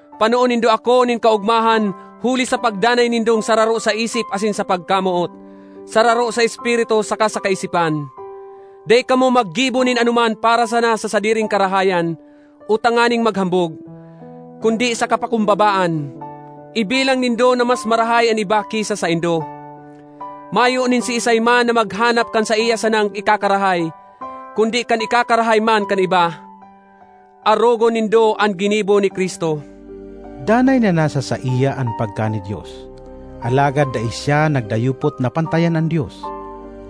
panoon nindo ako nin kaogmahan huli sa pagdanay nindong sararo sa isip asin sa pagkamoot, sararo sa espiritu saka sa kaisipan. Dai kamo maggibo nin anoman para sana sa sadiring karahayan o tanganing maghambog; kundi sa kapakumbabaan, ibilang nindo na mas marahay an iba ki sa saindo. Mayo nin siisay man na maghanap kan saiya sanang ikakarahay, kundi kan ikakarahay man kan iba. Arogon nindo an ginibo ni Cristo: Danay na nasa saiya an pagkani-Dios, alagad dai siya nagdayupot na pantayan an Dios,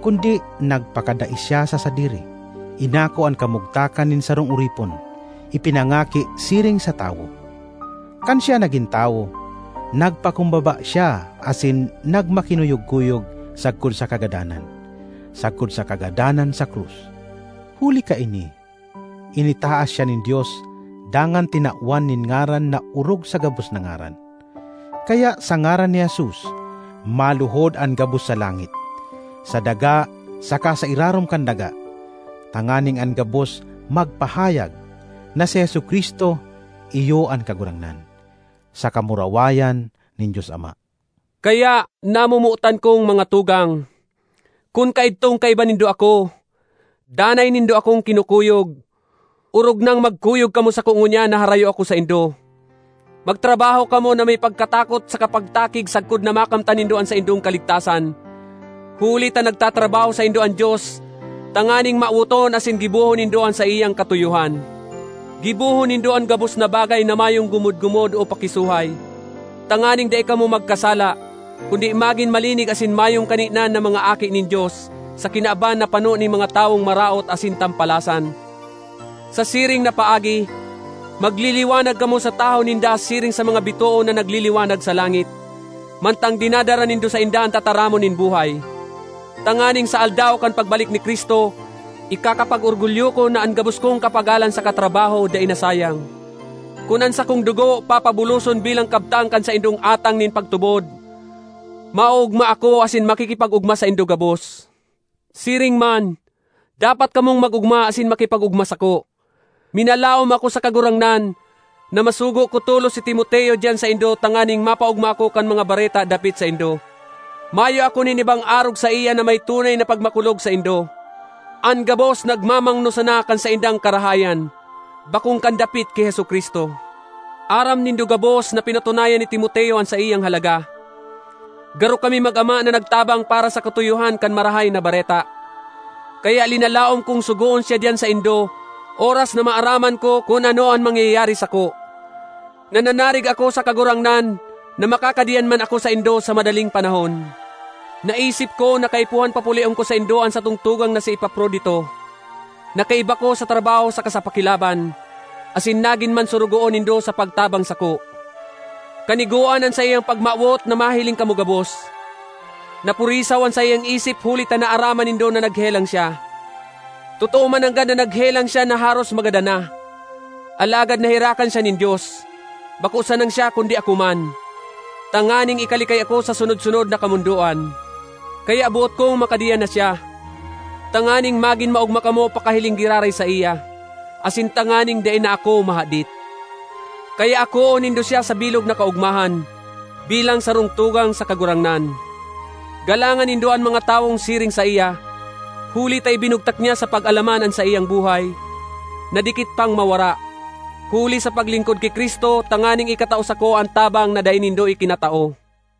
kundi nagpakadai siya sa sadiri, inako an kamugtakan nin sarong oripon, ipinangaki siring sa tawo. Kan siya nagin tawo, nagpakumbaba siya asin nagmakinuyog-kuyog sagkod sa kagadanan, sagkod sa kagadanan sa krus. Huli kaini, initaas siya nin Dios dangan tinawan nin ngaran na orog sa gabos na ngaran. Kaya sa ngaran ni Jesus, maluhod an gabos sa langit, sa daga saka sa irarom kan daga, tanganing an gabos magpahayag na si Jesu-Cristo iyo an Kagurangnan, sa kamurawayan nin Dios Ama. Kaya, namomotan kong mga tugang, kun kaidtong kaiba nindo ako, danay nindo akong kinukuyog, orog nang magkuyog kamo sako ngunyan na harayo ako saindo. Magtrabaho kamo na may pagkatakot saka pagtakig sagkod na makamtan nindo an saindong kaligtasan, huli ta nagtatrabaho saindo an Dios tanganing mawoton asin gibohon nindo an saiyang katuyohan. Gibohon nindo an gabos na bagay na mayong gumod-gumod o pakisuhay, tanganing dai kamo magkasala, kundi magin malinig asin mayong kaninan na mga aki nin Dios sa kinaban na pano nin mga tawong maraot asin tampalasan. Sa siring na paagi, magliliwanag kamo sa tahaw ninda siring sa mga bitoon na nagliliwanag sa langit, mantang dinadara nindo sainda an tataramon nin buhay, tanganing sa Aldaw kan pagbalik ni Cristo, ikakapag-orgulyo ko na an gabos kong kapagalan saka trabaho dai nasayang. Kun an sakong dugo papabuloson bilang kabtang kan saindong atang nin pagtubod, maoogma ako asin makikipag-ogma saindo gabos. Siring man, dapat kamong mag-ogma asin makipag-ogma sako. Minalaom ako sa Kagurangnan, na masugo ko tolos si Timoteo diyan saindo tanganing mapaogma ako kan mga bareta dapit saindo. Mayo ako nin ibang arog saiya na may tunay na pagmakulog saindo. An gabos nagmamangno sana kan saindang karahayan, bakong kan dapit ki Jesu-Cristo. Aram nindo gabos na pinatunayan ni Timoteo an saiyang halaga; garo kami mag-ama na nagtabang para sa katuyohan kan Marahay na Bareta. Kaya linalaom kong sugoon siya diyan saindo oras na maaraman ko kun ano an mangyayari sako. Nananarig ako sa Kagurangnan na makakadiyan man ako saindo sa madaling panahon. Naisip ko na kaipuhan papulion ko saindo an satong tugang na si Epaprodito, na kaiba ko sa trabaho saka sa pakilaban, asin nagin man sorogoon nindo sa pagtabang sako. Kanigoan an saiyang pagmawot na mahiling kamo gabos. Napurisaw an saiyang isip huli ta naaraman nindo na naghelang siya. Totoo mananggad na naghelang siya na haros magadan na; alagad naherakan siya nin Dios, bako sanang siya kundi ako man, tanganing ikalikay ako sa sunod-sunod na kamondoan. Kaya boot kong makadiyan na siya, tanganing magin maogma kamo pakahiling giraray saiya, asin tanganing dai na ako mahadit. Kaya akoon nindo siya sa bilog na kaogmahan, bilang sarong tugang sa Kagurangnan. Galangan nindo an mga tawong siring saiya, huli ta ibinugtak niya sa pag-alaman an saiyang buhay, na dikit pang mawara, huli sa paglingkod ki Cristo tanganing ikatao sako an tabang na dai nindo ikinatao.